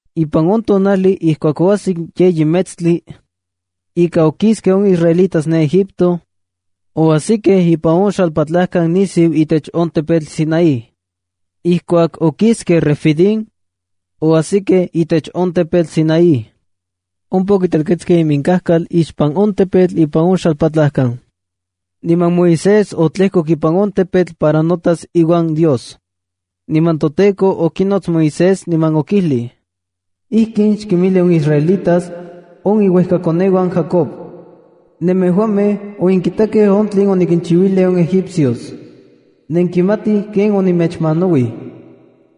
Ipan on tonajli ijkuak oajsik yeyi metstli ika okiskej on israelitas ne Egipto, oajsikej ipan on xalpatlajkan nisiu itech on tepetl Sinaí. Ijkuak okiskej Refidim, oajsikej itech on tepetl Sinaí. Ompa okitelketskej iminkajkal ixpan on tepetl ipan on xalpatlajkan. Niman Moisés otlejkok ipan on tepetl para notas iuan Dios. Niman toTEKO okinots Moisés niman okijlij: —Ijkin xkinmijli on israelitas, on iuejkakoneuan Jacob: “Nemejuamej onenkitakej on tlen onikinchiuilij on egipcios. Nenkimatij ken onemechmanauij.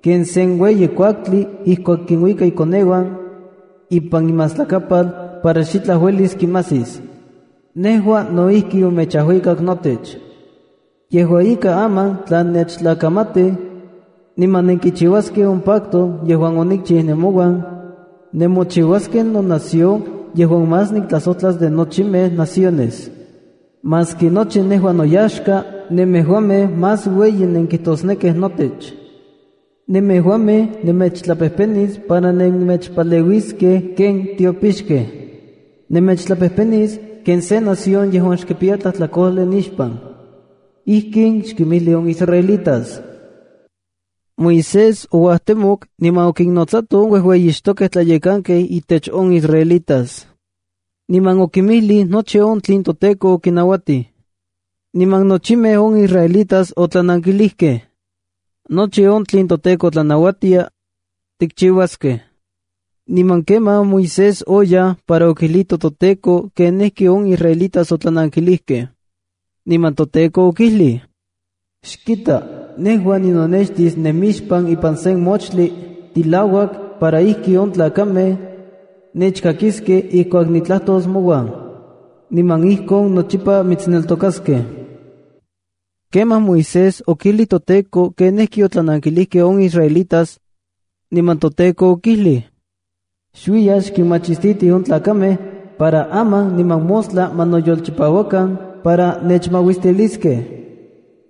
Ken sen ueyi kuaktlia ijkuak kinuika ikoneuan ipan imastlakapal para xitlaj uelis kimajsis, nejua no ijki onemechajuikak notech. Yejua ika, aman tla nennechtlakamatij niman nenkichiuaskej on pacto yejuan onikchiu nemouan, nemochiuaskej nonación yejuan más niktlajsojtlas de nochimej naciones. Maski nochi nejua noyaxka nemejuamej más ueyi nenkitosnekij notech. Nemejuamej nemechtlapejpenis para nennechpaleuiskej ken tiopixkej. Nemechtlapejpenis ken se nación yejuan xkipiya tlajtlakojli nixpan.” Ijkin xkinmijli on israelitas. Moisés ouajtemok niman okinnotsato on uejueyixtokej tlayekanaj intech on israelitas, niman okinmijlij nochi on tlen toTEKO okinauatij. Niman nochimej on israelitas otlanankilijkej: —Nochi on tlen toTEKO tlanauatia, tikchiuaskej. Niman kemaj Moisés oyaj para okijlito toTEKO kenijki on israelitas otlanankilijkej. Niman toTEKO okijlij: —Xkita, nejua ninonextis nemixpan ipan sen moxtli tilauak para ijki on tlakamej nechkakiskej ijkuak nitlajtos mouan. Niman ijkon nochipa mitsneltokaskej. Kemaj Moisés okijlij toTEKO kenijki otlanankilijkej on israelitas. Niman toTEKO okijlij: —Xuiya xkinmachistiti on tlakamej para aman niman mostla ma noyolchipauakan para nechmauistiliskej.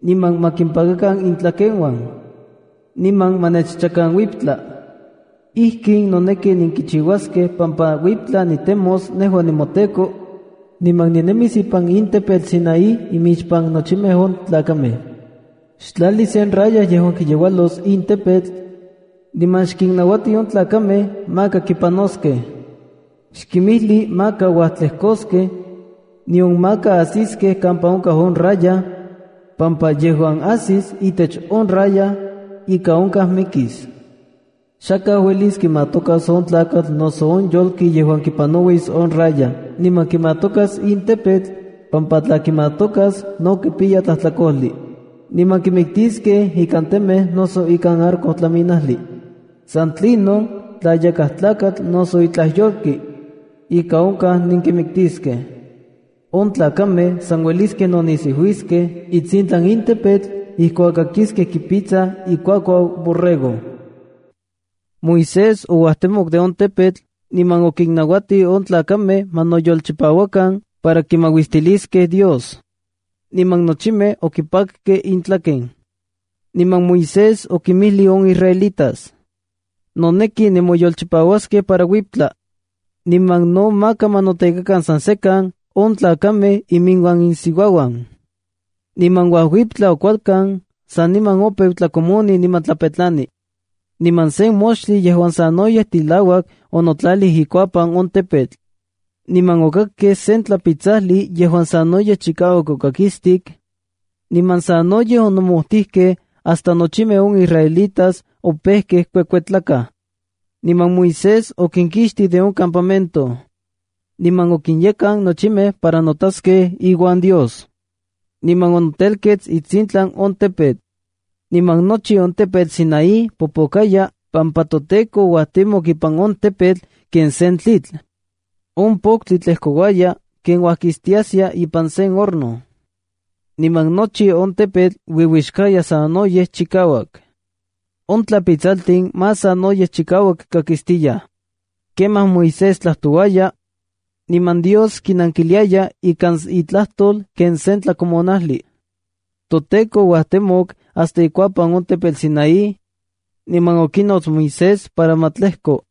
Niman ma kimpakakan intlakeuan, niman ma nechchakan uiptla. Ijkin noneki kichiuaskej pampa uiptla nitemos nejua nemoTEKO, niman ninemis ipan in tepetl Sinaí imixpan nochimej on tlakamej. Xtlali sen raya yejuan kiyeualos in tepetl, niman xkinnauati on tlakamej maka kipanoskej. Xkinmijli maka uajtlejkoskej, nion maka ajsiskej kampa onkaj on raya, pampa yejuan ajsis itech on raya ika onkaj mikis. Xakaj uelis kimatokas on tlakatl noso on yolki yejuan kipanauis on raya niman kimatokas in tepetl pampa tla kimatokas, no kipiyas tlajtlakojli niman nenkimiktiskej ikan temej noso ikan arco tlaminajli. San tlinon, tla yakaj tlakatl noso itlaj yolki, ika onkaj nenkimiktiskej. On tlakamej san ueliskej nonijsiuiskej itsintlan in tepetl ijkuak kakiskej kipitsaj ikuakuau borrego. Moisés ouajtemok de on tepetl niman okinnauatij on tlakamej ma noyolchipauakan para kimauistiliskej Dios. Niman nochimej okipakkej intlaken. Niman Moisés okinmijlij on israelitas: —Noneki nemoyolchipauaskej para uiptla. Niman no maka ma notekakan san sekan on tlakamej iuan iminsiuauan. Niman uajuiptla kualkan saniman opeu tlakomoni niman tlapetlani. Niman sen moxtli yejuan sanoyej tilauak onotlalij ikuapan on tepetl. Niman okakkej sen tlapitsajli yejuan sanoyej chikauak okakistik niman sanoyej onomojtijkej hasta nochimej on israelitas opejkej kuekuetlakaj. Niman Moisés okinkixtij de on campamento, niman okinyekan nochimej para notaskej iuan Dios. Niman onotelketskej itsintlan on tepetl. Niman nochi on tepetl Sinaí popokaya pampa toTEKO ouajtemok ipan on tepetl ken sen tlitl. On poktli tlejkouaya ken uajkistiaskia ipan sen horno, niman nochi on tepetl uiuixkaya sanoyej chikauak. On tlapitsaltin más sanoyej chikauak kakistiyaj, Kemaj Moisés tlajtouaya, niman Dios kinankiliaya ikan itlajtol ken sen tlakomonajli. ToTEKO ouajtemok hasta ikuapan on tepetl Sinaí niman okinots Moisés para ma tlejko.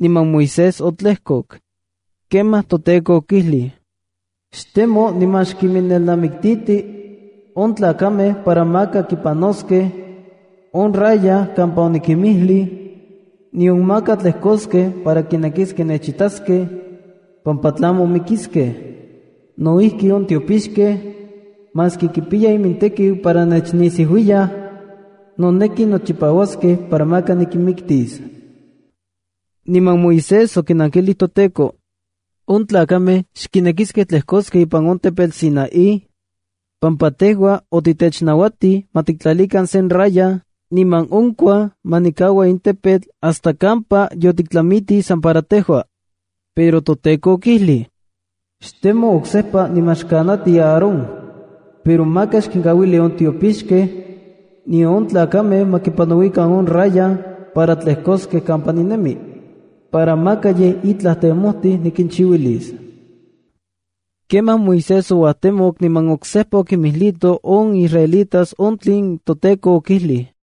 Niman Moisés otlejkok. Kemaj toTEKO okijlij: —Xtemo niman xkinmelnamikiltiti on tlakamej para maka kipanoskej on raya kampa onikinmijlij, nion maka tlejkoskej para kinekiskej nechitaskej, pampa tlamo mikiskej. No ijki, on tiopixkej, maski kipiyaj imintekiu para nechnisiuiyaj, noneki nochipauaskej para maka nikinmiktis. Niman Moisés okinankilij toTEKO: —On tlakamej xkinekiskej tlejkoskej ipan in tepetl Sinaí, pampa tejua otitechnauatij ma tiktlalikan sen raya niman onkuaj ma nikaua in tepetl hasta kampa yotiktlamitij san para tejua. Pero toTEKO okijlij: —Xtemo oksejpa niman xkanati Aarón. Pero maka xkinkauili on tiopixkej, nion on tlakamej ma kipanauikan on raya para tlejkoskej kampa ninemi, para maka yej itlaj temojtij nikinchiuilis. Kemaj Moisés ouajtemok niman oksejpa okinmijlito on israelitas on tlen toTEKO okijlij.